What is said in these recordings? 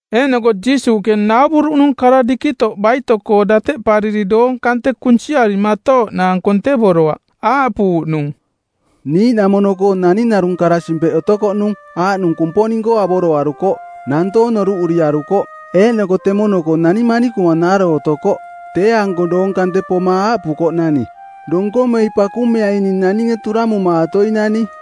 Eeꞌnoko Jiisuuꞌke nauvuruꞌnung kara dikitoꞌ baito-koo dateꞌpariri doong kante kunsiarimatooꞌnaang kontevoroaꞌ. Aaꞌpuuꞌnung, “Niiꞌnamono-koo naning narung kara-simpeꞌ otokoꞌnung, aaꞌnung Kumponing-koo avoroarukoꞌ, nantoong noruꞌuriarukoꞌ. Eeꞌnoko temono-koo nani manikuma naaro otokoꞌ, tee-anko doong kante poma aaꞌpukoꞌnani, ‘Donkomei pakumeai ning naninge turamumaatoinani.’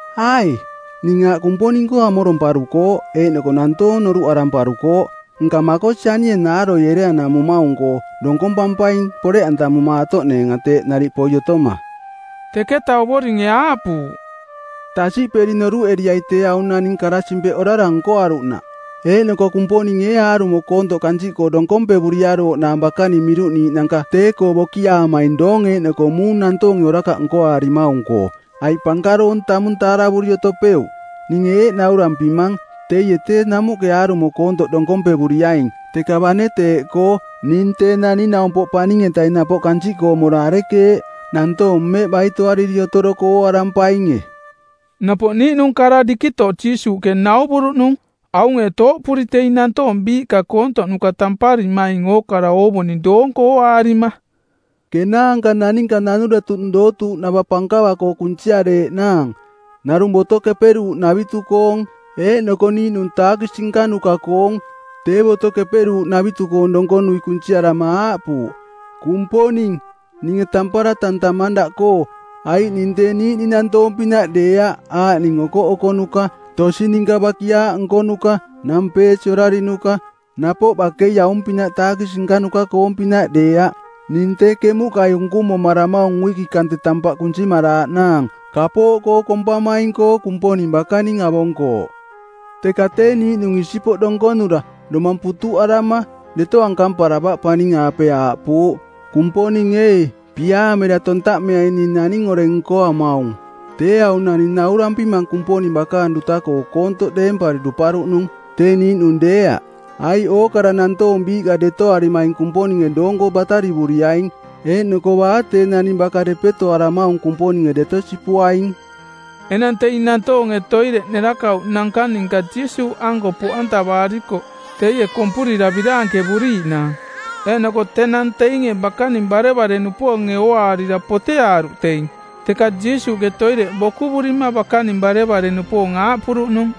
‘Ai, ning aaꞌ Kumponing-koo amoromparukooꞌ eeꞌnoko nantoong noruꞌaramparukooꞌ, nka makosi anie naaroi ereanamumaung-koo donkompampaing poreꞌantamumaatoꞌneenga teeꞌ nariꞌ poi otoma.’” Teketa Ovoringe aaꞌpuuꞌ, “Tasiꞌperi noruꞌeriai tee aung naning kara-simpeꞌ orara nkoaruꞌnaꞌ. Eeꞌnoko Kumponinge ee aarumo koontoꞌ kansiꞌkoo donkompevuriarooꞌnaang bakaning miruꞌniiꞌnanka tee-koo bokiaamaing doong eeꞌnoko muung nantoonge orakaꞌ nkoaarimaung-koo? Aiꞌ pankaroong tamung taaravuri otopeuꞌ? Ninge eeꞌ naurampimang, teie tee namuꞌke aarumo koontoꞌ donkompevuriaing. Teka bane teeꞌkoo, ning Tee Naning-naumpoꞌ Paning-etaing napoꞌ kansiꞌkoo mora arekeeꞌ, nantoong mmeꞌ baitoariri otoroko ooarampaing e?” Napoꞌ niiꞌnung narung kara dikitoꞌ Jiisuuꞌke nauvuruꞌnung aunge tooꞌpuri teing nantoong biiꞌka koontoꞌnuka tamparimaing ookara oovuning doonko ooaarima, “Kenaanka naninka nanuretuꞌnung dootuuꞌnava pankava-koo kunsiareeꞌnaang, narung Boto Keperuuꞌnavitu-koong eeꞌnoko niiꞌnung taakisi nkanuka-koong. Tee Boto Keperuuꞌnavitu-koong donkonui kunsiarama aaꞌpuuꞌ, ‘Kumponing, ninge tampara tantamang daꞌkoo, aiꞌ ning tee niiꞌning nantoong-pinaꞌ deeaꞌ aaꞌning okoꞌokonuka, tosi ninka bakiaaꞌ nkonuka, nampeesi orarinuka, napoꞌ bakei aung-pinaꞌ taakisi nkanuka-koong-pinaꞌ deeaꞌ. Ning tee kemuꞌkai unkumomaramaung uiki kante tampaꞌ kunsimaraaꞌnaang. Kapooꞌkoo kompamaing-koo Kumponing bakaning avonkooꞌ.’ “Teka tee niiꞌnung isipoꞌ donkonura, domang putuꞌarama, deto ankamparavaꞌ paning-aape aaꞌpuuꞌ, ‘Kumponing ee, piaamera tontaꞌmeai ning naning oreng nkoamaung.’ Tee aung naning naurampimang Kumponing bakaang duta-koo koontoꞌ deempari duparuꞌnung, tee niiꞌnung deeaꞌ. Aiꞌ ookara nantoong biiꞌka detoarimaing Kumponinge doonko batarivuriaing, eeꞌnoko baa tee naning baka depetoaramaung Kumponinge deto sipuaing.” Enang teing nantoonge toireꞌ nerakauꞌnanka ninka Jiisuuꞌanko poꞌantavaarikoꞌ teie kompurira biraankevuriiꞌnaang. Eeꞌnoko tenang teinge bakaning barevare-nupoonge ooaarira poteaaruꞌ teing. Teka Jiisuuꞌke toireꞌ bokuvurima bakaning barevare-nupoong aaꞌpuruꞌnung,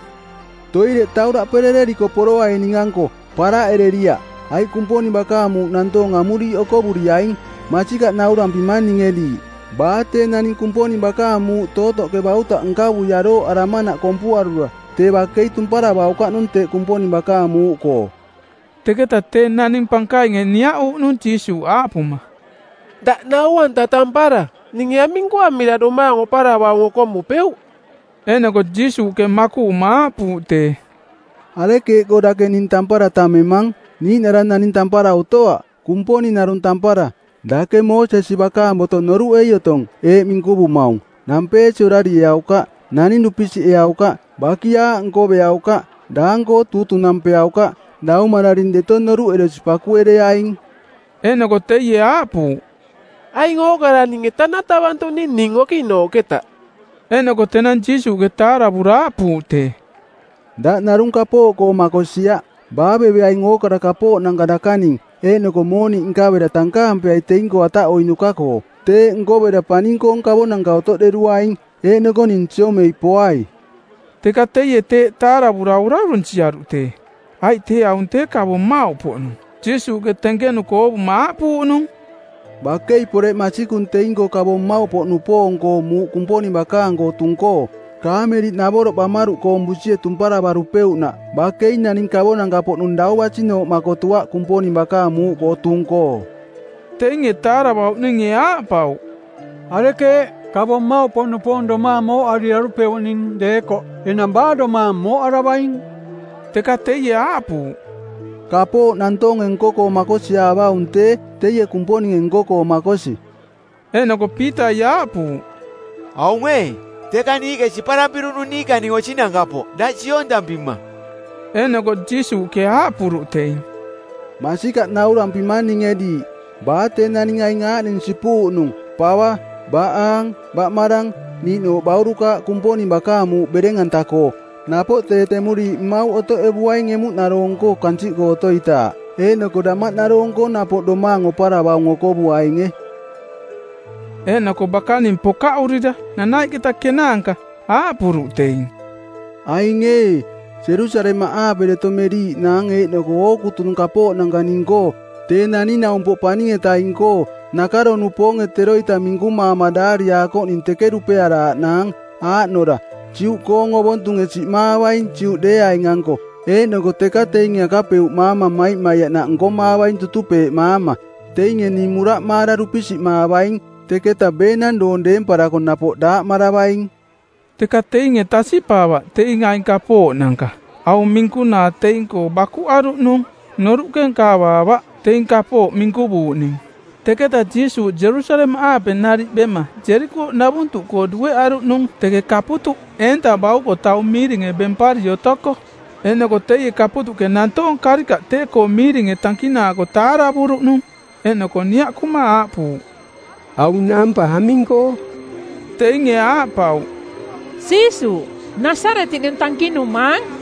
“Toireꞌ tauraꞌperereriko poroai ning-anko, paraꞌereriaꞌ, aiꞌ Kumponing bakaang muuꞌ nantoong amuriiꞌ okovuriaing. Masikaꞌ naurampimang ninge diiꞌ, baa tee naning Kumponing bakaang muuꞌ tootoꞌke bautaꞌ nkavui arooꞌaramanaꞌ kompuarura tee bakei tumparavaukaꞌnung teꞌ Kumponing bakaang muuꞌkoo.” Teketa tee naning pankainge niaꞌuuꞌnung Jiisuuꞌ, aaꞌpuma, “Daꞌ nau-anta tampara, ninge aming nkoamira domaang oparavaung okomupeuꞌ?” Eeꞌnoko Jiisuuꞌke makuꞌuma aaꞌpuuꞌ tee, “Arekeeꞌkoo dake ning tampara tammemang? Niiꞌnara naning tampara otoaꞌ. Kumponing narung tampara. Dake Moosesi bakaang boto noruꞌei otong, eeꞌ minkuvumaung, ‘Nampeesi orarieaukaꞌ, naning dupisiꞌeaukaꞌ, bakiaaꞌ nkoveaukaꞌ, daang-koo tuutunampeaukaꞌ, daumararing deto noruꞌeresi pakuereaing.’” Eeꞌnoko teie aaꞌpuuꞌ, “Aing ookara ninge tanatavantuꞌning ning okiꞌnaꞌnooꞌketa.” Eeꞌnoko tenang Jiisuuꞌke taaravura aaꞌpuuꞌ tee, “Daꞌ narung kapooꞌkoo makosiaꞌ. Baaveveaing ookara kapooꞌnanka dakaning, eeꞌnoko mooniꞌ nkavera tankaampeai teing-koo ataꞌoiꞌnuka-koo. Teeꞌ nkovera paning-koong kavonanka otoꞌderuaing. Eeꞌnoko ning siomei poai.” Teka teie teeꞌ taaravura orarunsiaruꞌ tee, aiꞌ tee aung tee kavo mmauꞌpoꞌnung. Jiisuuꞌke tenkenuko oovuma aaꞌpuuꞌnung, “Bakei poreꞌ masikung teing-koo kavo mmauꞌpoꞌnupoong-koo muuꞌ Kumponing bakaang-koo tung-koo. Kaameliꞌnavoroꞌ bamaruꞌkoong busie tumparavarupeuꞌnaꞌ bakei naning kavonanka-poꞌnung dau basinooꞌ makotuaꞌ Kumponing bakaang muuꞌkoo tung-koo.” Teinge taaravauꞌninge aaꞌpauꞌ, “Arekeeꞌ? Kavo mmauꞌpoꞌnupoong domaang mooꞌariarupeuꞌning deekoꞌ enang baa domaang mooꞌaravaing?” Teka teie aaꞌpuuꞌ, “Kapooꞌ nantoonge nko-koo makosiaavaung tee, teie Kumponinge nko-koo makosi.” Eeꞌnoko Piitai aaꞌpuuꞌ, “Aung ee, teka niiꞌke siparampiruꞌnung niikaning osinanka-poꞌ daꞌ siontampima.” Eeꞌnoko Jiisuuꞌke aaꞌpuruꞌ teing, “Masikaꞌ naurampimang ninge diiꞌ, baa tee naning aing aaꞌning sipuuꞌnung: pava, baꞌaang, baꞌmarang, niiꞌnooꞌ baurukaaꞌ Kumponing bakaang muuꞌ bereng-anta-koo, napoꞌ tee temuriiꞌ mmauꞌ otoꞌevuaing emuꞌnaroong-koo kansiꞌkoo otoitaaꞌ; eeꞌnoko damaꞌnaroong-koo napoꞌ domaang oparavaung okovuainge.” Eeꞌnoko bakaning pokaꞌurira nanaiꞌketa kenaanka aaꞌpuruꞌ teing, “Aing ee, Jerusalemaꞌaape deto meriiꞌnaang eeꞌnoko ookutunung kapooꞌnanka ning-koo, Tee Naning-naumpoꞌ Paning-etaing-koo, nakaro-nupoonge teroita minkumaama daariakoꞌning teke dupearaaꞌnaang, aaꞌnora: Juꞌkoong ovontunge siꞌmaavaing Juꞌdeeaing-anko, eeꞌnoko teka teinge akapeuꞌmaama maimaiaꞌnaꞌ nkomaavaing tutupeeꞌmaama. Teinge ning muraꞌmaara dupisiꞌmaavaing, teketa beenang doong deemparako napoꞌ daaꞌmaravaing.” Teka teinge tasiꞌpaavaꞌ teing aing kapooꞌnanka. Aung minkunaa tee teing-koo bakuꞌaruꞌnung, noruꞌke nkavaavaꞌ teing kapooꞌ minkuvuuꞌning. Teketa Jiisuuꞌ Jerusalemaꞌaape nariꞌ bema Jerikooꞌnavuntuꞌkoo dueꞌaruꞌnung teke kaputuꞌ, eenta bauko, taung miiringe baꞌnampari otoko. Eeꞌnoko teie kaputuꞌke nantoong karikaꞌ tee-koo miiringe tankinaako taaravuruꞌnung eeꞌnoko niaꞌkuma aaꞌpuuꞌ, “Aung naampa aming-koo?” Teinge aaꞌpauꞌ, “Jiisuuꞌ, Nasaretiꞌnung tankinumaang.”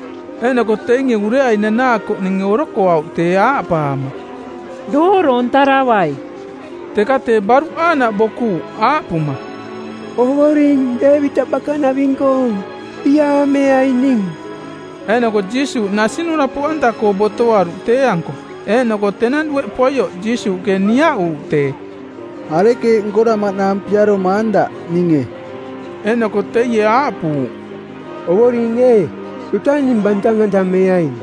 Eeꞌnoko teinge ureai nanaakoꞌninge orokoauꞌ tee aaꞌpaama, “Dooroontaravai!” Teka tee baruꞌ aaꞌnaꞌ bokuuꞌ aaꞌpuma, “Ovoring Deevitaꞌ bakanaving-koong, piaameai ning!” Eeꞌnoko Jiisuuꞌ nasinura poꞌanta-koo botoaruꞌ tee-anko. Eeꞌnoko tenang dueꞌ poioꞌ Jiisuuꞌke niaꞌuuꞌ tee, “Arekeeꞌ nkoramaꞌnaang piaromaang daꞌ, ninge?” Eeꞌnoko teie aaꞌpuuꞌ, “Ovoring ee, duta ning bantang-antameaing.”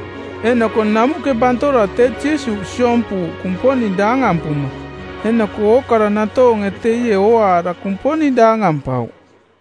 Eeꞌnoko namuꞌke bantora tee Jiisuuꞌ siompuuꞌ Kumponing daangampuma. Eeꞌnoko ookara nantoonge teie ooaara Kumponing daangampauꞌ.